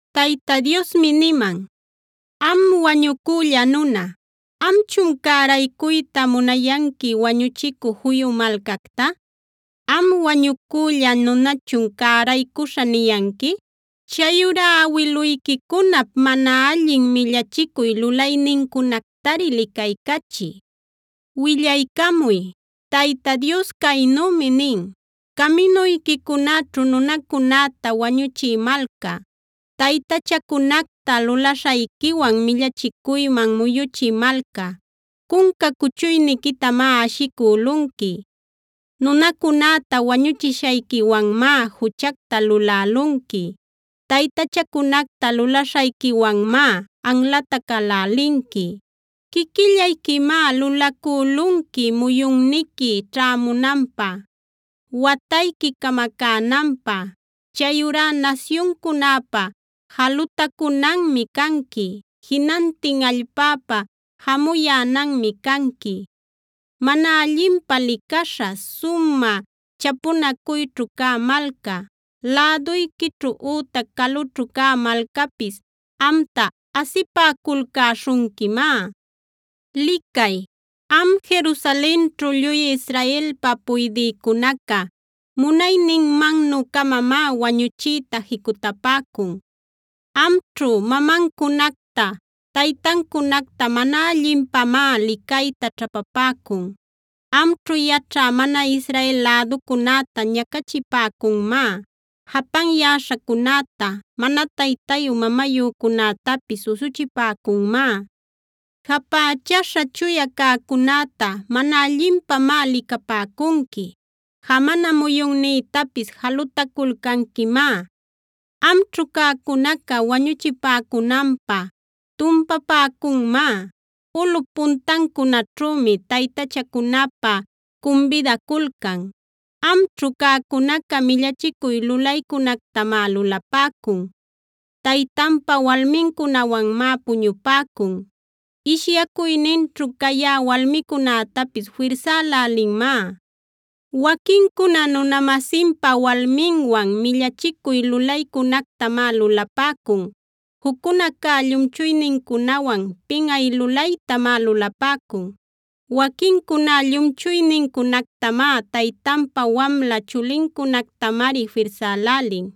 Tayta Diosmi niman: “Am wañucülla nuna, ¿amchun cäraycuyta munayanqui wañuchicü juyu malcacta? ¿Am wañucülla nunachun ‘cäraycuśhä’ niyanqui? Chayurá awiluyquicunap mana allin millachicuy lulaynincunactari licaycachiy. Willaycamuy: Tayta Dios caynümi nin: Caminuyquicunaćhu nunacunäta wañuchï malca, taytachacunacta lulaśhayquiwan millachicuyman muyuchï malca, cunca cuchuyniquitamá ashicülunqui. Nunacunäta wañuchishayquiwanmá juchacta lulälunqui. Taytachacunacta lulaśhayquiwanmá anlatacälälinqui. Quiquillayquimá lulacülunqui muyunniqui ćhämunanpä, watayqui camacänanpä. Chayurá nasyuncunäpa jalutacunanmi canqui, jinantin allpäpa jamuyänanmi canqui. Mana allinpä licaśha, sumä chapunacuyćhu cä malca, läduyquićhu ütac calućhu cä malcapis amta asipäculcäśhunquimá. “Licay, am Jerusalenćhu lluy Israelpa puydïcunaca munayninmannu-camamá wañuchiyta jicutapäcun. Amćhu, mamancunacta taytancunacta mana allinpamá licayta ćhapapäcun. Amćhu yaćhä mana Israel läducunäta ñacachipäcunmá. Japanyäśhacunäta, mana taytayu mamayücunätapis usuchipäcunmá. Japächaśha chuya cäcunäta mana allinpamá licapäcunqui. Jamana muyunnïtapis jalutaculcanquimá. Amćhu cäcunaca wañuchipäcunanpä tumpapäcunmá; ulꞌup puntancunaćhümi taytachacunapä cumbidaculcan. Amćhu cäcunaca millachicuy lulaycunactamá lulapäcun. Taytanpa walmincunawanmá puñupäcun; ishyacuyninćhu cayä walmicunätapis firsälälinmá. Waquincuna nuna-masinpa walminwan millachicuy lulaycunactamá lulapäcun. Juccunacá llumchuynincunawan pinꞌay lulaytamá lulapäcun. Waquincuná llumchuynincunactamá, taytanpa wamla chulincunactamari firsälälin.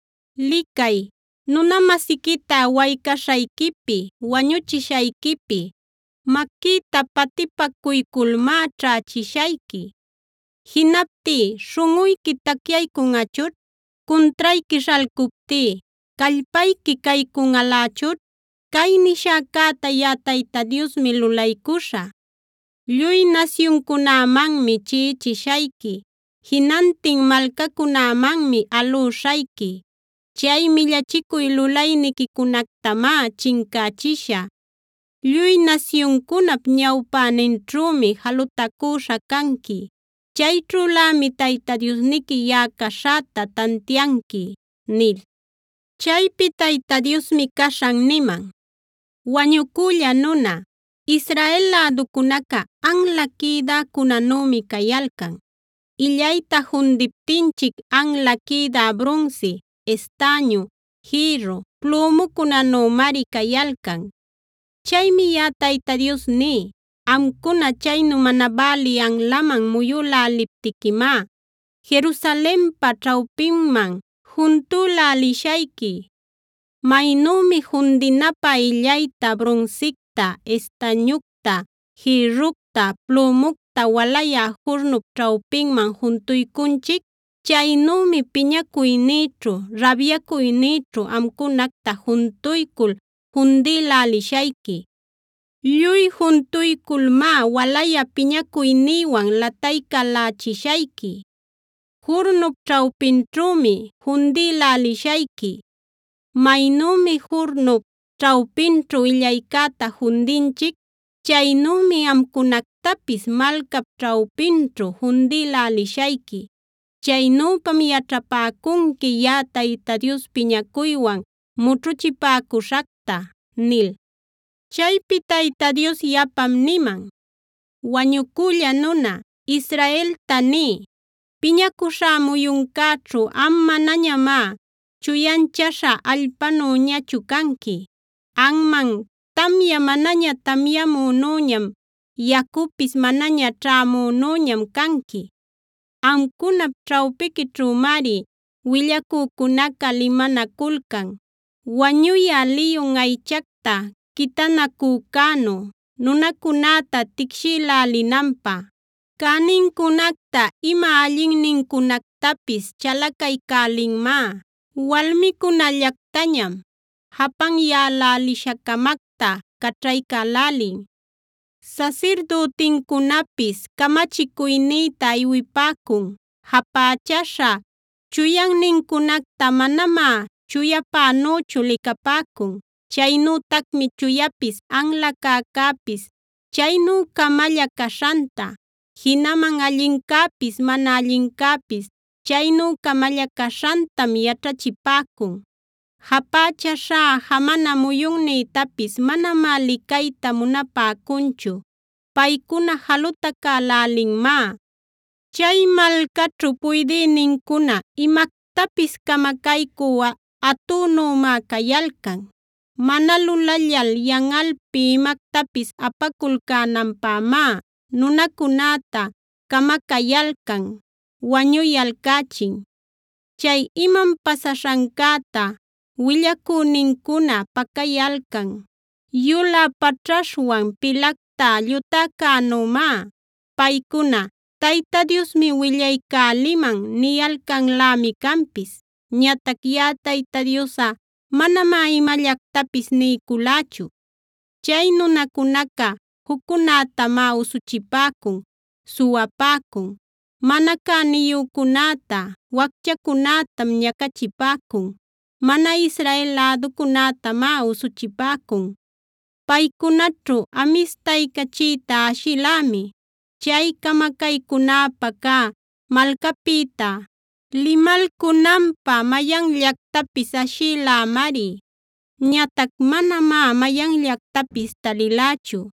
“Licay, nuna-masiquita waycaśhayquipi, wañuchishayquipi maquïta patipacuyculmáa ćhächishayqui. Jinaptí ¿śhunꞌuyqui tacyaycunꞌachućh? Cuntrayqui śhalcuptí ¿callpayqui caycunꞌalächućh? Cay nishäcäta yaꞌa Tayta Diosmi lulaycuśhä. Lluy nasyuncunämanmi chiꞌichishayqui; jinantin malcacunämanmi alüśhayqui. Chay millachicuy lulayniquicunactamá chincächishä. Lluy nasyuncunap ñawpäninćhümi jalutacüśha canqui. Chayćhülämi Tayta Diosniqui yaꞌa caśhäta tantianqui” nil. Chaypi Tayta Diosmi caśhan niman: “Wañucülla nuna, Israel läducunaca anla quïdäcunänümi cayalcan. Illayta fundiptinchic anla quïdä brunsi, estañu, jïrru, plümucunänümari cayalcan. Chaymi yaꞌa Tayta Dios ní: Amcuna chaynu mana bälï anlaman muyüläliptiquimá Jerusalenpa ćhawpinman juntülälishayqui. Maynümi fundinapä illayta, brunsicta, estañucta, jïrructa, plümucta walayä jurnup ćhawpinman juntuycunchic, chaynümi piñacuynïćhu, rabyacuynïćhu amcunacta juntuycul fundïlälishayqui. Lluy juntuyculmá walayä piñacuynïwan lataycälächishayqui; jurnup ćhawpinćhümi fundïlälishayqui. Maynümi jurnup ćhawpinćhu illaycäta fundinchic, chaynümi amcunactapis malcap ćhawpinćhu fundïlälishayqui. Chaynüpam yaćhapäcunqui yaꞌa Tayta Dios piñacuywan mućhuchipäcuśhacta” nil. Chaypi Tayta Dios yapam niman: “Wañucülla nuna, Israelta niy: Piñacuśhá muyuncäćhu am manañamá chuyanchaśha allpanüñaćhu canqui; anman tamya manaña tamyamünüñam, yacupis manaña ćhämünüñam canqui. Amcunap ćhawpiquićhümari willacücunaca limanaculcan, wañuyä liyun aychacta quitanacücänu nunacunäta ticshïlälinanpä. Cänincunacta ima allinnincunactapis chalacaycälinmá; walmicunällactañam japanyälälisha-camacta caćhaycälälin. Sasirdütincunapis camachicuynïtam iwipäcun, japächaśha chuyannincunacta manamá chuyapänüchu licapäcun. Chaynütacmi chuyapis anla cäcäpis chaynu-camalla caśhanta, jinaman allincäpis mana allincäpis chaynu-camalla caśhantam yaćhachipäcun. Japächaśhá jamana muyunnïtapis manamá licayta munapäcunchu; paycuna jalutacälälimanmá. Chay malcaćhu puydïnincuna imactapis camacaycü atünümá cayalcan. Mana lulallal yanꞌalpi imactapis apaculcänanpämá nunacunäta camacayalcan, wañuyalcächin. Chay imam pasaśhancäta willacünincuna pacayalcan yulä paćhaśhwan pilacta llutäcänümá. Paycuna: ‘Tayta Diosmi willaycäliman’ niyalcanlämi canpis. Ñatac yaꞌa Tayta Diosꞌa manamá imallactapis niyculächu. Chay nunacunaca juccunätamá usuchipäcun, suwapäcun; mana cäniyücunäta, wacchacunätam ñacachipäcun; mana Israel läducunätamá usuchipäcun. Paycunaćhu amistaycachïta ashilämi; chay camacaycunäpä cä malcapïta limalcunanpä mayanllactapis ashilämari. Ñatac manamá mayanllactapis talilächu.